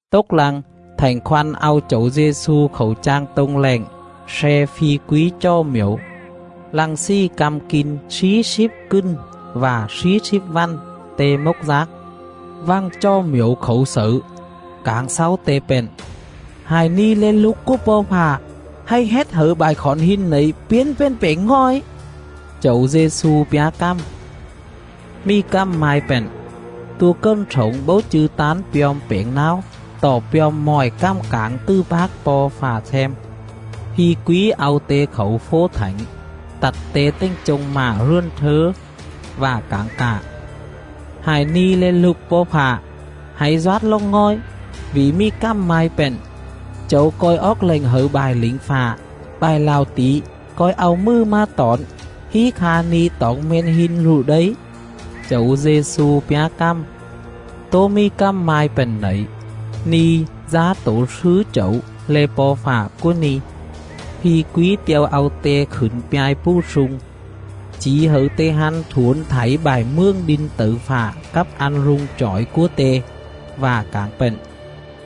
Tốc lăng, Thảnh Khoăn au Chẩu Dê-xu khảu chang tô̱ng lẹng sle phi quí chò mjẩu.. Lăng slì căm kin slí slíp cừn vạ slí slíp vằn, Te mốc dác. Vằng chò mjẩu khảu xẩư, cảng xáu Te pện: “Hại ni̱ le̱ Lục cúa Po̱ Fạ, hạy hết hẩư bại khỏn hin nẩy piến pền pẻng ngòi.” Chẩu Dê-xu pjá cằm: “Mì cằm mai pện: ‘Tua cần slổng bố chư̱ tán pjom pẻng náo, tọ pjom mọi cằm cảng tứ pác Po̱ Fạ them.’”. Phi quí au Te khảu fố thảnh, tặt Te tềnh chông mạ rườn slớ, vạ cảng cạ: “Hại ni̱ le̱ Lục Po̱ Fạ, hạy doát lồng ngòi, vỉ mì cằm mai pện: ‘Chẩu co̱i oóc lệnh hẩư bại lỉnh fạ, Bại lạo tỉ co̱i au mừ mà tỏn, Hí kha ni̱ toỏng me̱n hin rụ đây.’”. Chẩu Dê-xu pjá cằm: “Tố mì cằm mai pện nẩy: ‘Ni̱ dá tổ slứ Chẩu le̱ Po̱ Fạ cúa ni̱.’”. Phi quí te̱o au Te khửn pjai pù slung, chỉ hẩư Te hăn thuổn thảy bại mường đin tẩư fạ cắp ăn rung chỏi cúa te, vạ cảng pện: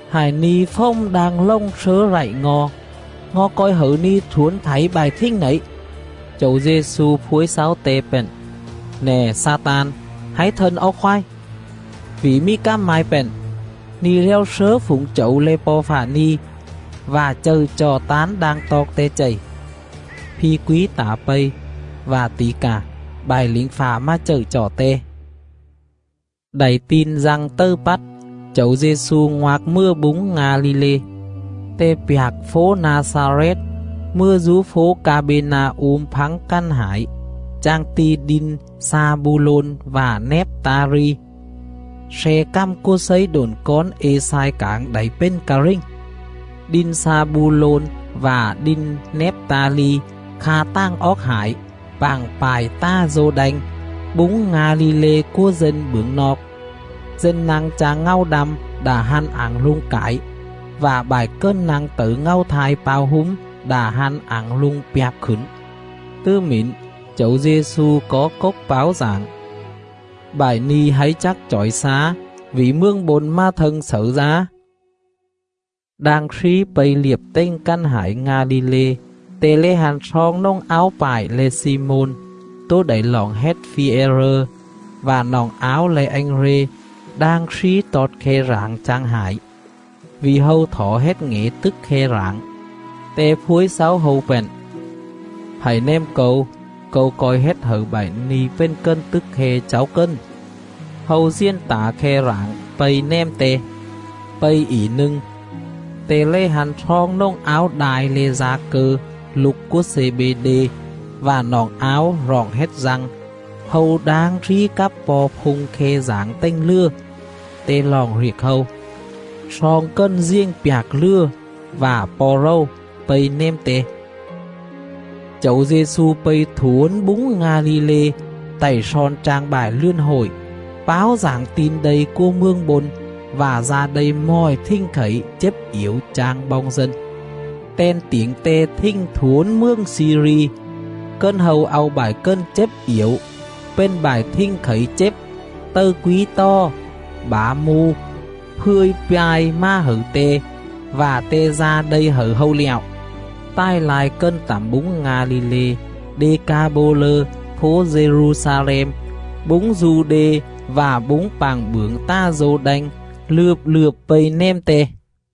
“Hại ni̱ fồm đang lồng slớ lạy ngo̱, ngo̱ co̱i hẩư ni̱ thuổn thảy bại thình nẩy.” Chẩu Dê-xu phuối xáu te pện: “Nè Xa-tan, hạy thân oóc khoái! Vỉ mì cằm mai pện: ‘Ni̱ lèo slớ phủng Chẩu le̱ Po̱ Fạ ni̱, vạ chậư chọ tán đang toọc Te chầy.’”. Phi quí tả pây, vạ tỉ cà, bại lỉnh fạ mà chậư chọ Te. Đảy tin Dăng tầư pắt, Chẩu Dê-xu ngoạc mừa búng Nga-li-lê.. Te pjạc fố Na-xa-rét, mừa dú fố Ca-bê-na-um phắng cằn hải, chang ti̱ đin Xa-bu-lôn vạ Nép-ta-li,. sle cằm cúa slấy độn cón Ê-xai cảng đảy pền ca rình: “Đin Xa-bu-lôn vạ đin Nép-ta-li,. Kha tàng oóc hải, pạng pại ta̱ Dô-đanh, Búng Nga-li-lê cúa dân bưởng noọc — Dân nă̱ng chang ngàu đăm, Đạ hăn ảng rung cải; Vạ bại cần nă̱ng tẩư ngàu thai pao húm, Đạ hăn ảng rung pjạp khửn.” Tứ mỉn, Chẩu Dê-xu có cốc páo dảng: “Bại ni̱ hạy chắc chỏi xá, vỉ Mường Bôn mà thâng xẩư dá.”. Đang slí pây liệp tềnh cằn hải Nga-li-lê, Te lè hăn sloong nồng áo pạo le̱ Xi-môn, tố đảy roọng hết Phi-e-rơ, vạ noọng áo le̱ Anh-rê đang slí tọt khe rảng chang hải, vỉ hâu thỏ hết ngẻ tức khe rảng. Te phuối xáu hâu pện: “Hạy nèm Câu, Câu co̱i hết hẩư bại ni̱ pền cần tức khe cháu cần.” Hâu diền tả khe rảng, pây nèm Te. Pây ỉ nâng, Te lè hăn sloong nồng áo đai le̱ Da-cơ, lục cúa Xê-bê-đê, vạ noọng áo roọng hết Dăng, hâu đang slí cắp po̱ phung khe rảng tềnh lừa. Te roọng riệc hâu. Sloong cần diền pjạc lừa vạ po̱ rầu, pây nèm Te. Chẩu Dê-xu pây thuổn búng Nga-li-lê, tạy slon chang bại rườn hội, páo dảng Tin Đây Mtt: Tin Fằng. cúa Mường Bôn, vạ da đây mọi thình khẩy, chếp iểu chang boong dân.. Ten tiểng Te thình thuổn mường Xi-ri. Cần hâu au bại cần chếp iểu, pền bại thình khẩy chếp, tầư quí tò, bả mu, fươ̱i pa̱i mà hẩư Te, vạ Te da đây hẩư hâu lẹo. Tài lai cần tẳm búng Nga-li-lê, Đê-ca-bô-lơ, Đê-ca-bô-lơ: ngịa le̱ “Slíp Fố”. fố Dê-ru-xa-lem, búng Du-đê vạ búng pạng bưởng ta̱ Dô-đanh lượp lượp pây nèm Te.